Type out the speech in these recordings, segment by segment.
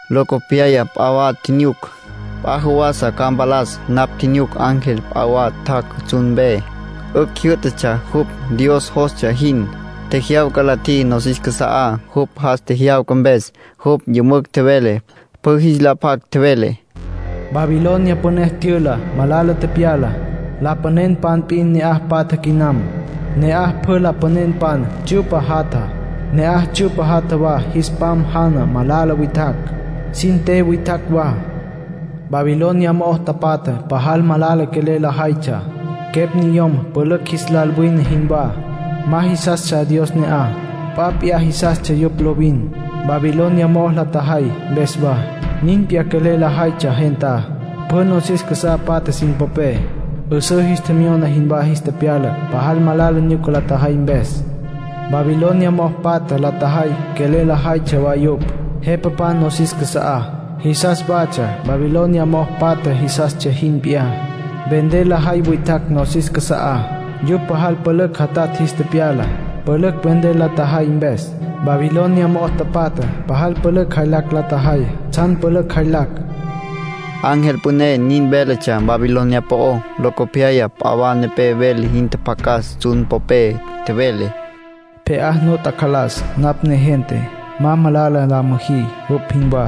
Locopyaya p'a wa tjinyuc, p'a jawasa ca mpalas. Napj tjinyuc ángel p'a wa tjac' tsjun mpe. 'Ücj jyǘ'tatsja jupj Dios jostsja jin. Tjejyawca la tjiji nosis casa'á, jupj jas tjejyawca mpes. Jupj yümücj tjevele, pjü jis la pac. Tjevele: “Babilonia Püné tyüla, malala tepyala. Lapanenpan p'in ne'aj patja quinam. Ne'aj pjü lapanenpan tsyu'pa jatja. Ne'aj tsyu'pa jatja wa jis pam jana malala witjacj, sin te witjacj wa. Babilonia mo'ó tapatjá pajal malala quelel lajaytsja, quepj niyom pülücj jis lal wine jinwá. Ma jisastsja Dios ne'aj. P'a p'iyá jisastsja yupj lovin. Babilonia mo'ó la tjajay mpes wa, nin p'iyá quelel lajaytsja gentá, pjü nosis casá patja sin popé. 'Üsǘ jis tjemyona jinwá jis tepyala pajal malala nyuca la tjajay mpes. Babilonia mo'o patja la tjajay quelel lajaytsja wa yupj. Jepapan nosis casa'á, jisas watsja Babilonia mo'o patja jisastsja jin p'iyá. Vender lajay witjacj nosis casa'á, yupj pajal pülücj jatatj jis tepyala, pülücj vender la tjajay mpes. Babilonia mo'ó tapatjá pajal pülücj jaylacj la tjajay tsjan pülücj jaylacj”, ángel püné nin véletsja Babilonia po'ó. Locopyaya p'a wa nepé vele jin tjapjacas tsjun popé. Tjevele: “Pje'á nu tacalas napj negente, ma malala la müjí jupj jinwá,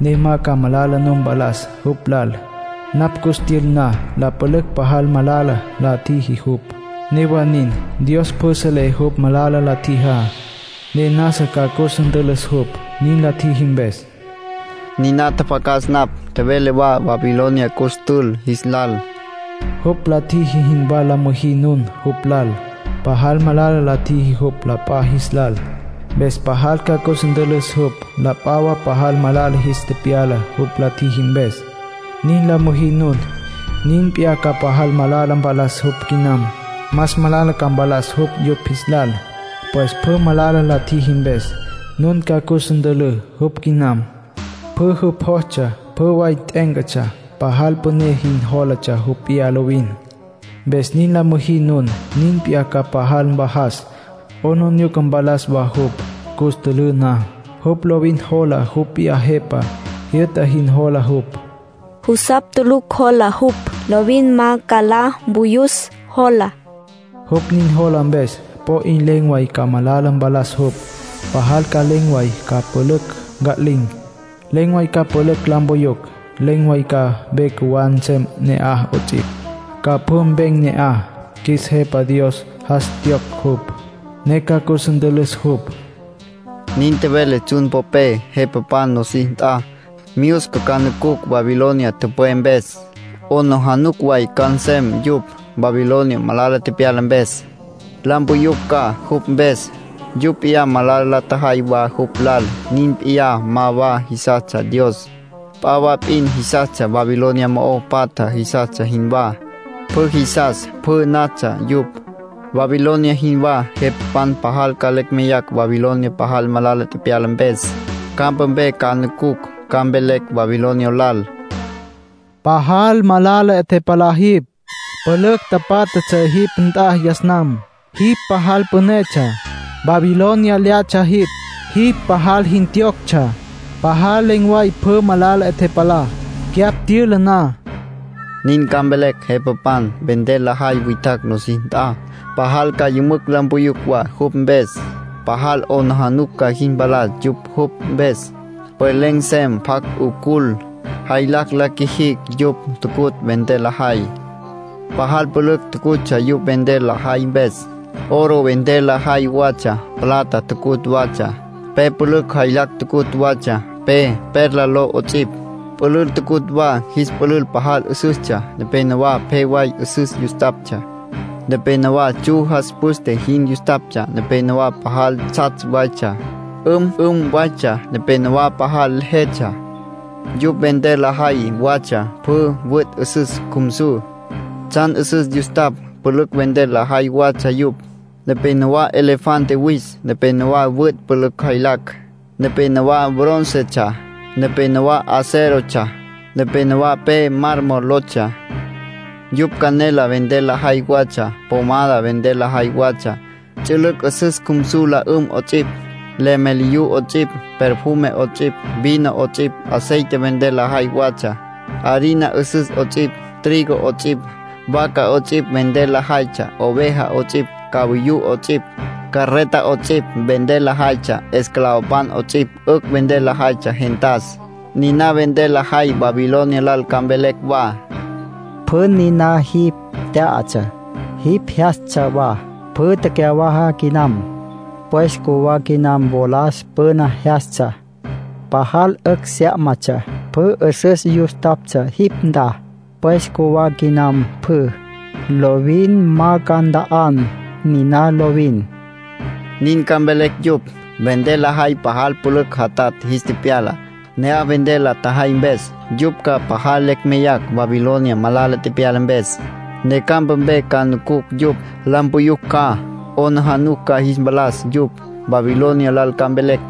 ne ma ca malala nu mpalas jupj lal, napj cus tyül na. La pülücj pajal malala la tjiji jupj, newa nin. Dios pjü selé jupj malala la tjijá, ne nasa ca cus ntülüs jupj, nin la tjiji mpes”, niná tjapjacas napj. Tjevele wa Babilonia cus tül jis lal: “Jupj la tjiji jinwá la müjí nun jupj lal. Pajal malala la tjiji jupj la p'a jis lal, mpes pajal ca cus ntülǘ jupj. La p'a wa pajal malala jis tepyala jupj la tjiji mpes. Nin la müjí nun, nin p'iyá ca pajal malala mpalas jupj quinam. Más malala ca mpalas jupj yupj jis lal. Pues pjü malala la tjiji mpes, nun ca cus ntülǘ jupj quinam. Pjü jupj jostsja, pjü way t'e'éncatsja. Pajal püné jin jólatsja jupj p'iyá lovin. Mpes nin la müjí nun, nin p'iyá ca pajal mvajas, 'aplijila mpalas wa jupj, cus ntülǘ na. Jupj lovin jola jupj p'iyá jepa, jyü'ta jin jola jupj. Jusapj tulucj jola jupj; lovin ma ca la mpuyus, jola. Jupj nin jola mpes, po 'in len̈ way ca malala mpalas jupj. Pajal ca len̈ way ca pülücj nca'lin̈. Len̈ way ca pülücj la mpuyucj, len̈ way ca ve cjuwá nsem ne'aj 'ots'ipj. Ca pjü mpem ne'aj. Qjuis Jepa Dios jas tjiyocj jupj, ne ca cus ntülüs jupj”, nin tjevele tsjun popé. Jepapan nosis nt'a, myusca ca nucucj Babilonia tüpwé mpes. 'Aplijila way ca nsem yupj, Babilonia malala tepyala mpes. La mpuyucj ca, jupj mpes. Yupj p'iyá malala la tjajay wa jupj lal. Nin p'iyá ma wa jisastsja Dios. P'a wa p'in jisastsja, Babilonia mo'o patja jisastsja jinwá. Pjü jisas, pjü natsja yupj, Babilonia jinwá. Jepapan pajal ca lecj meyacj Babilonia pajal malala tepyala mpes. Campa mpe ca nucucj, ca mvelecj Babilonia lal: “Pajal malala 'e tepalá jipj. Pülücj tapátjatsja jipj nt'a yas nam. Jipj pajal pünetsja. Babilonia lyatsja jipj. Jipj pajal jin tjiyoctsja. Pajal len̈ way pjü malala 'e tepalá, cyapj tyüla na”, nin ca mvelecj jepapan. Vender lajay witjacj nosis nt'a, pajal ca yümücj la mpuyucj wa jupj mpes. Pajal 'aplijila ca jis mpalas yupj jupj mpes. Pues len̈ nsem pjacj 'ucul, jaylacj la qjuijicj yupj tucutj vender lajay. Pajal pülücj tucutsja yupj vender lajay mpes. Oro vender lajay watsja. Plata tucutj watsja. Pe pülücj jaylacj tucutj watsja, pe perla ló 'ots'ipj. Pülül tucutj wa. Jis pülül pajal 'üsüstsja, nepénowa pje way 'üsüs yustaptsja, nepénowa tsju jas püste jin yustaptsja, nepénowa pajal tsjatsj waytsja, 'üm'üm waytsja, nepénowa pajal jetsja. Yupj vender lajay watsja pjü wüt' 'üsüs cjumsu. Tsjan 'üsüs yustapj, pülücj vender lajay watsja yupj, nepénowa elefante wis, nepénowa wüt' pülücj jaylacj, nepénowa bróncetsja, nepénowa acérotsja, nepénowa pe mármol lotsja. Yupj canela vender lajay watsja. Pomada vender lajay watsja, ts'ülüc' 'üsüs cjumsu la 'üm 'ots'ipj, lemeliyú 'ots'ipj, perfume 'ots'ipj, vino 'ots'ipj, aceite vender lajay watsja, harina 'üsüs 'ots'ipj, trigo 'ots'ipj. Vaca 'ots'ipj vender lajaytsja, oveja 'ots'ipj, cavayú 'ots'ipj. Carreta 'ots'ipj vender lajaytsja, esclavopan 'ots'ipj. 'Ücj vender lajaytsja gentas. Niná vender lajay, Babilonia lal ca mvelecj wa: “Pjü niná jipj tyatsja, jipj jyastsja wa, pjü tecyawaja quiyam. Pues cjuwá quinam wolas püna jyastsja, pajal 'ücj syá'matsja. Pjü 'üsüs yustaptsja jipj nt'a, pues cjuwá quinam pjü. Lovin ma ca nta'an niná lovin”, nin ca mvelecj yupj. Vender lajay pajal pülücj jatatj jis tepyala, ne'aj vender la tjajay mpes. Yupj ca pajal lecj meyacj Babilonia malala tepyala mpes, ne campa mpe ca nucucj yupj. La mpuyucj ca; 'aplijila ca jis mpalas yupj. Babilonia lal ca mvelecj: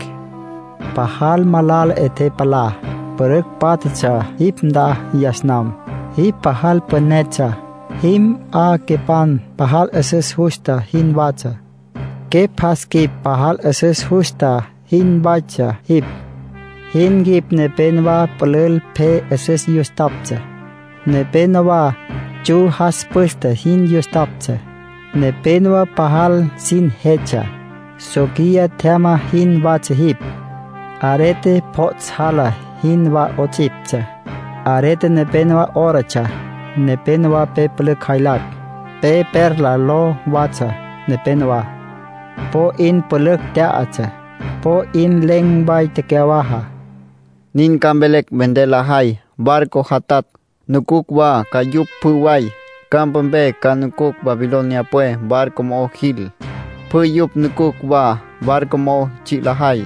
“Pajal malala 'e tepalá. Pülücj pátjatsja jipj nt'a yas nam. Jipj pajal pünetsja. Jim 'a quepan pajal 'üsüs justa jinwatsja. Quepj jas quip pajal 'üsüs justa jinwatsja jipj. Jin quip nepénowa pülül pje 'üsüs yustaptsja, nepénowa tsju jas püste jin yustaptsja, nepénowa pajal sin jetsja. Soquiya tjyama jinwatsja jipj, arete pjots' jala jinwá 'ots'iptsja, arete nepénowa órotsja, nepénowa pe pülücj jaylacj, pe perla ló watsja nepenowá. Po 'in pülücj tyatsja, po 'in len̈ way tecyawaja”, nin ca mvelecj vender lajay. Barco jatatj, nucucj wa ca yupj pjü way, campa mpe. Ca nucucj Babilonia pwe. Barco mo'o jil, pjü yupj nucucj wa ca, barco mo'o tsji' lajay,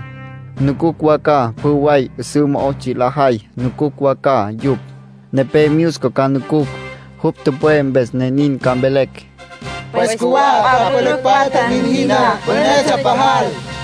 nucucj wa ca. Pjü way 'üsǘ mo'ó tsji' lajay, nucucj wa ca yupj. Nepé myusca ca nucucj, jupj tüpwé mpes, ne nin ca mvelecj: “Pues cjuwá p'a pülücj patja nin jiná. Pünetsja pajal.”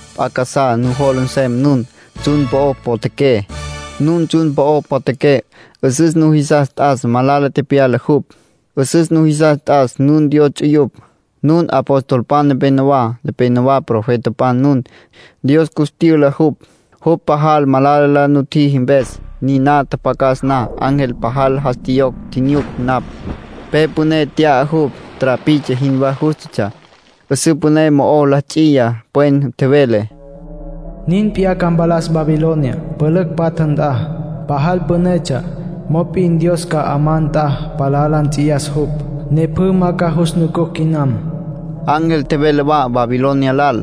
P'a casá nujola nsem nun, tsjun po'o potjaqué. Nun tsjun po'o potjaqué, 'üsüs nujisas t'as malala tepyala jupj. 'Üsüs nujisas t'as nun Dios ts'uyupj, nun apostolpan nepenowá, nepénowa profetapan nun. Dios cus tyüla jupj, jupj pajal malala la nutjiji mpes. Niná tjapjacas na, ángel pajal jas tjiyocj tjinyuc napj. Pe püné nt'ya jupj, trapiche jinwá jústatsja. 'Üsǘ püné mo'o la ts'iya pwen, tjevele: “Nin p'iyá ca mpalas Babilonia, pülücj patja nt'a. Pajal pünetsja, mop'in Dios ca 'amá nt'a palá la nts'iyas jupj, ne pjü ma ca jus nucucj quinam.” Ángel tjevele wa Babilonia lal: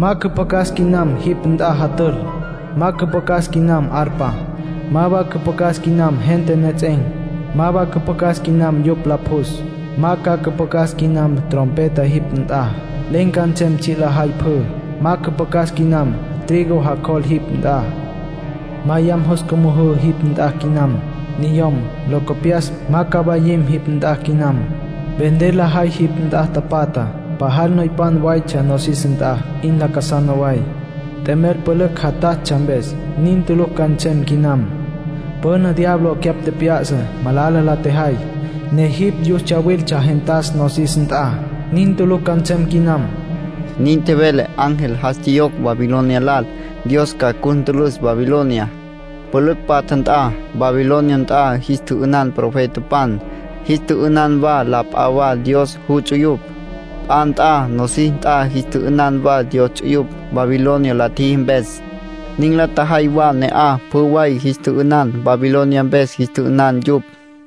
“Ma cüpjacas quinam jipj nt'a jatül. Ma cüpjacas quinam arpa. Ma wa cüpjacas quinam gente nejets'en̈. Ma wa cüpjacas quinam yupj la pjus. Ma ca cüpjacas quinam trompeta jipj nt'a. Len̈ ca nsem tsji' lajay pjü. Ma cüpjacas quinam trigo jacjol jipj nt'a. Ma yam jus cümüjǘ jipj nt'a quinam. Niyom, locopyas, ma ca mwayim jipj nt'a quinam. Vender lajay jipj nt'a tapatjá, pajal noypan waytsja nosis nt'a 'in lacasana way, t'emel pülücj jatatsja mpes; nin tulucj ca nsem quinam. Püna diablo cyapj tjep'ya'sa malala la tjejay, ne jipj yus tsyawiltsja gentas nosis nt'a. Nin tulucj ca nsem quinam”, nin tjevele ángel jas tjiyocj Babilonia lal. Dios ca cus ntülüs Babilonia, pülücj patja nt'a. Babilonia nt'a jis tjü'ünan profetapan, jis tjü'ünan wa la p'a wa Dios juts'uyupj. P'a nt'a nosis nt'a jis tjü'ünan wa Dios ts'uyupj. Babilonia la tjiji mpes, nin la tjajay wa ne'aj. Pjü way jis tjü'ünan, Babilonia mpes jis tjü'ünan yupj.